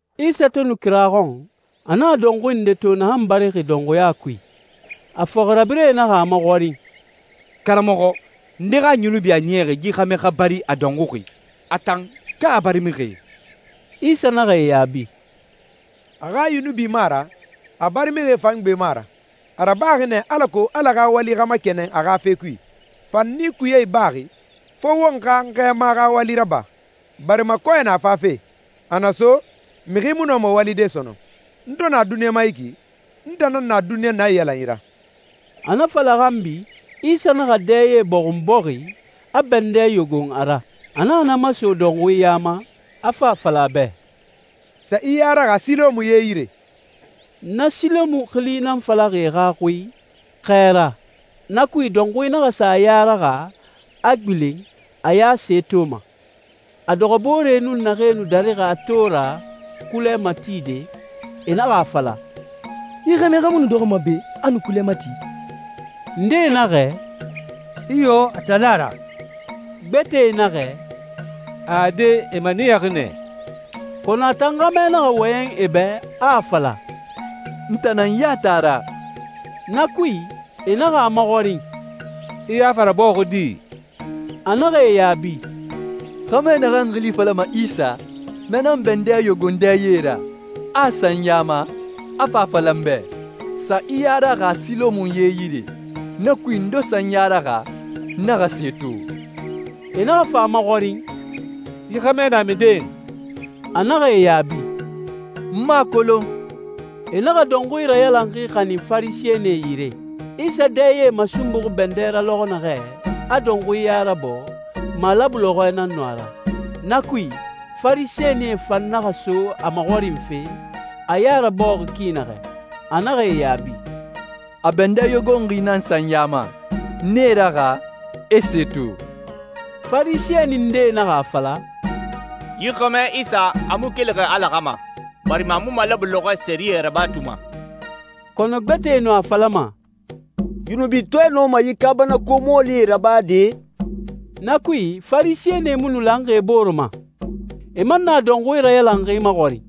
Isa to nu kira xɔn, a naxa dɔnxui nde to naxan barixi dɔnxuya kui. A fɔxirabirɛe naxa a maxɔrin, «Karamɔxɔ, nde xa yunubi a niyaxi yi xɛmɛ xa bari a dɔnxuxi, a tan ka a barimixie?» Isa naxa e yaabi, «A xa yunubi mu a ra, a barimixie fan gbe mu a ra. A rabaxi nɛ alako Ala xa wali xa makɛnɛn a xa fe kui. Fanni kuye ibaxi, fo won xa n Xɛɛma xa wali raba, barima kɔɛ na fafe. A na so, mixi mu nɔma walide sɔnɔn. N to na duniɲa ma yi ki, n tan nan na duniɲa naiyalanyi ra.» A na fala xanbi, Isa naxa dɛye bɔxun bɔxi, a bɛndɛ yogon a ra. A naxa na maso dɔnxui ya ma, a fa a fala a bɛ, «Sa i ya raxa Silɔmu ye yire.» Na Silɔmu xili nan falaxi e xa xui, «Xɛɛra». Na kui, dɔnxui naxa sa a ya raxa, a gbilen, a ya se toma. A dɔxɔbooree nun naxee nu darixi a to ra kulɛ matide, e naxa a fala, «Yi xɛmɛ xa mu nu dɔxɔma be, a nu kulɛ mati?» Ndee naxɛ, «Iyo, a tan nan a ra.» Gbɛtɛe naxɛ, «Ade, e maniyaxi nɛ.» Kɔnɔ a tan xɛmɛ naxa wɔyɛn e bɛ, a a fala, «N tan nan yati a ra!» Na kui, e naxa a maxɔrin, «I ya fa rabɔɔxi di?» A naxa e yaabi, «Xɛmɛ naxan xili falama Isa, na nan bɛndɛ yogon dɛye ra, a a sa n ya ma, a fa a fala n bɛ, ‹Sa i ya raxa Silɔmu ye yire.› Na kui, n to sa n ya raxa, n naxa se to.» E naxa fa a maxɔrin, «Yi xɛmɛ na minden?» A naxa e yaabi, «N mu a kolon.» E naxa dɔnxui rayalanxi xanin Farisɛnie yire. Isa dɛye masunbuxi bɛndɛ ra lɔxɔ naxɛ, a dɔnxui ya rabɔɔ, malabu lɔxɔɛ nan nu a ra. Na kui, Farisɛnie fan naxa so a maxɔrinfe, a ya rabɔɔxi ki naxɛ. A naxa e yaabi, «A bɛndɛ yogonxi nan sa n ya ma, n e raxa, e se to.» Farisɛni ndee naxa a fala, «Yi xɛmɛ Isa, a mu kelixi Ala xa ma, barima a mu malabu lɔxɔɛ sɛriyɛ rabatuma.» Kɔnɔ gbɛtɛe nu a falama, «Yunubitɔɛ nɔma yi kaabanako mɔɔlie rabade?» Na kui, Farisɛnie mu nu lanxi e bore ma. E man naxa dɔnxui rayalanxi maxɔrin,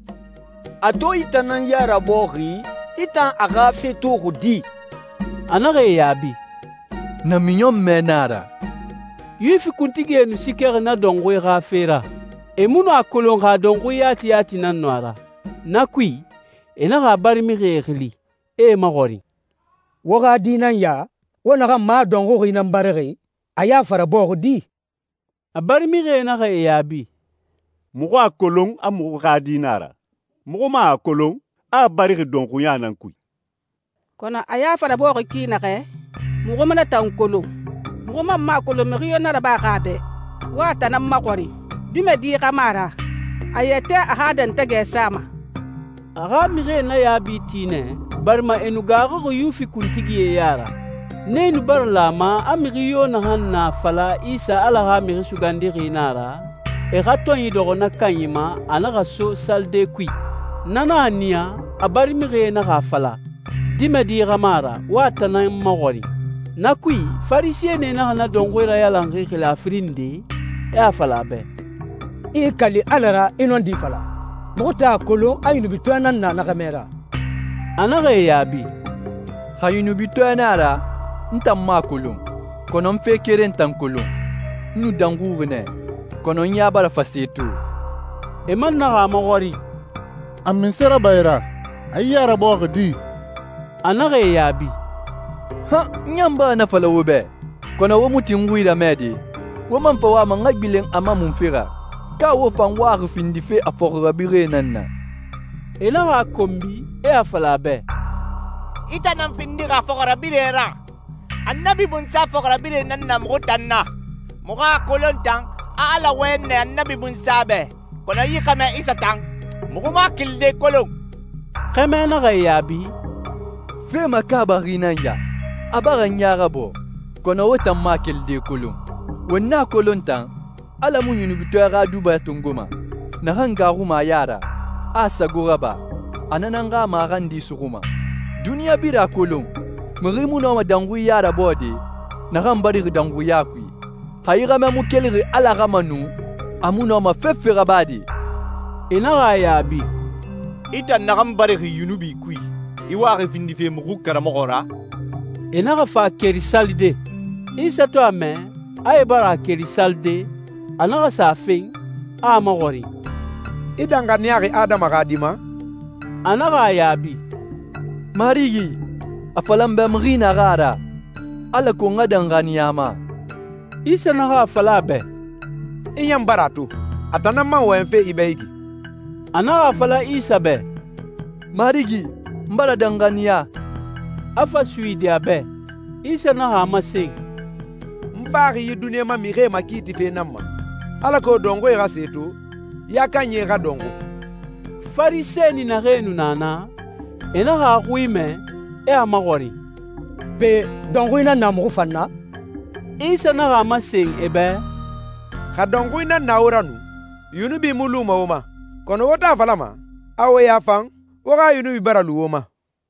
«A to i tan nan ya rabɔɔxi, I tan a xa fe toxi di?» A naxa e yaabi, «Namiɲɔnmɛ nan a ra.» Yuwifi kuntigie nu siikɛxi na dɔnxui xa fe ra. E mu nu a kolon xa dɔnxui yati yati nan nu a ra. Na kui, e naxa a barimixie xili, e e maxɔrin, «Wo xa di nan ya, wo naxan ma a a dɔnxuxi nan barixi? A ya fa rabɔɔxi di?» A barimixie naxa e yaabi, «Muxu a kolon, a muxu xa di nan a ra. Muxu man a kolon, a a barixi dɔnxuya nan kui. Kɔnɔ a ya fa rabɔɔxi ki naxɛ, muxu mu na tan kolon. Muxu man mu a kolon mixi yo na rabaxi a bɛ. Wo a tan nan maxɔrin. Dimɛdi xa mu a ra, a yɛtɛ a xa dɛntɛgɛ sama.» A xa mixie na yaabi ti nɛ, barima e nu gaaxuxi Yuwifi kuntigie ya ra. Nee nu bara lan a ma a mixi yo naxan na a fala Isa Ala xa Mixi Sugandixi nan a ra, e xa tɔnyi dɔxɔ na kanyi ma a naxa so salide kui. Na nan a niya a barimixie naxa a fala, «Dimɛdi xa mu a ra, wo a tan nan maxɔrin.» Na kui, Farisɛnie naxa na dɔnxui rayalanxi xili a firin nde, e a fala a bɛ, «I i kali Ala ra, i nɔndi fala. Muxu tan a kolon a yunubitɔɛ nan na na xɛmɛ ra.» A naxa e yaabi, «Xa yunubitɔɛ nan a ra, n tan mu a kolon. Kɔnɔ n fe keren tan kolon: N nu dɔnxuxi nɛ, kɔnɔ n ya bara fa se to.» E man naxa a maxɔrin, «A munse raba i ra? A i ya rabɔɔxi di?» A naxa e yaabi, «N ɲan bara na fala wo bɛ, kɔnɔ wo mu tin n xui ramɛde. Wo man fa wama n xa gbilen a ma munfe ra? Ka wo fan waxi findife a fɔxirabirɛe nan na?» E naxa a konbi, e a fala a bɛ, «I tan nan findixi a fɔxirabirɛ ra! Annabi Munsa fɔxirabirɛe nan na muxu tan na! Muxu a kolon tan, a Ala wɔyɛn nɛ Annabi Munsa bɛ, kɔnɔ yi xɛmɛ Isa tan, muxu mu a kelide kolon.» Xɛmɛ naxa e yaabi, «Fe makaabaxi nan ya! A bara n ya rabɔɔ, kɔnɔ wo tan mu a kelide kolon! Won a kolon tan, a Ala mu yunubitɔɛ xa duba tongoma. Naxan gaaxuma a ya ra, a a sago raba, a na nan xa maxandi suxuma. Duniɲa birin a kolon mixi mu nɔma dɔnxui ya rabɔɔde naxan barixi dɔnxuya kui. Xa yi xɛmɛ mu kelixi Ala xa ma nu, a mu nɔma fefe rabade.» E naxa a yaabi, «I tan naxan barixi yunubi kui, i waxi findife muxu karamɔxɔ ra?» E naxa fa a keri salide. Isa to a mɛ, a e bara a keri salide, a naxa sa a fen, a a maxɔrin, «I danxaniyaxi Adama xa Di ma?» A naxa a yaabi, «Marigi, a fala n bɛ mixi naxan a ra, alako n xa danxaniya a ma.» Isa naxa a fala a bɛ, «I ɲan bara a to. A tan nan man wɔyɛnfe i bɛ yi ki.» A naxa a fala Isa bɛ, «Marigi, n bara danxaniya.» A fa a suyidi a bɛ. Isa naxa a masen, «N faxi yi duniɲa ma mixie makiitife nan ma, alako dɔnxui xa se to, ya kanyi xa dɔnxu.» Farisɛni naxee nu na naa, e naxa a xui mɛ, e a maxɔrin, «Pe, dɔnxui nan na muxu fan na?» Isa naxa a masen e bɛ, «Xa dɔnxui nan na wo ra nu, yunubi mu luma wo ma. Kɔnɔ wo to a falama, a wo ya fan, wo xa yunubi bara lu wo ma.»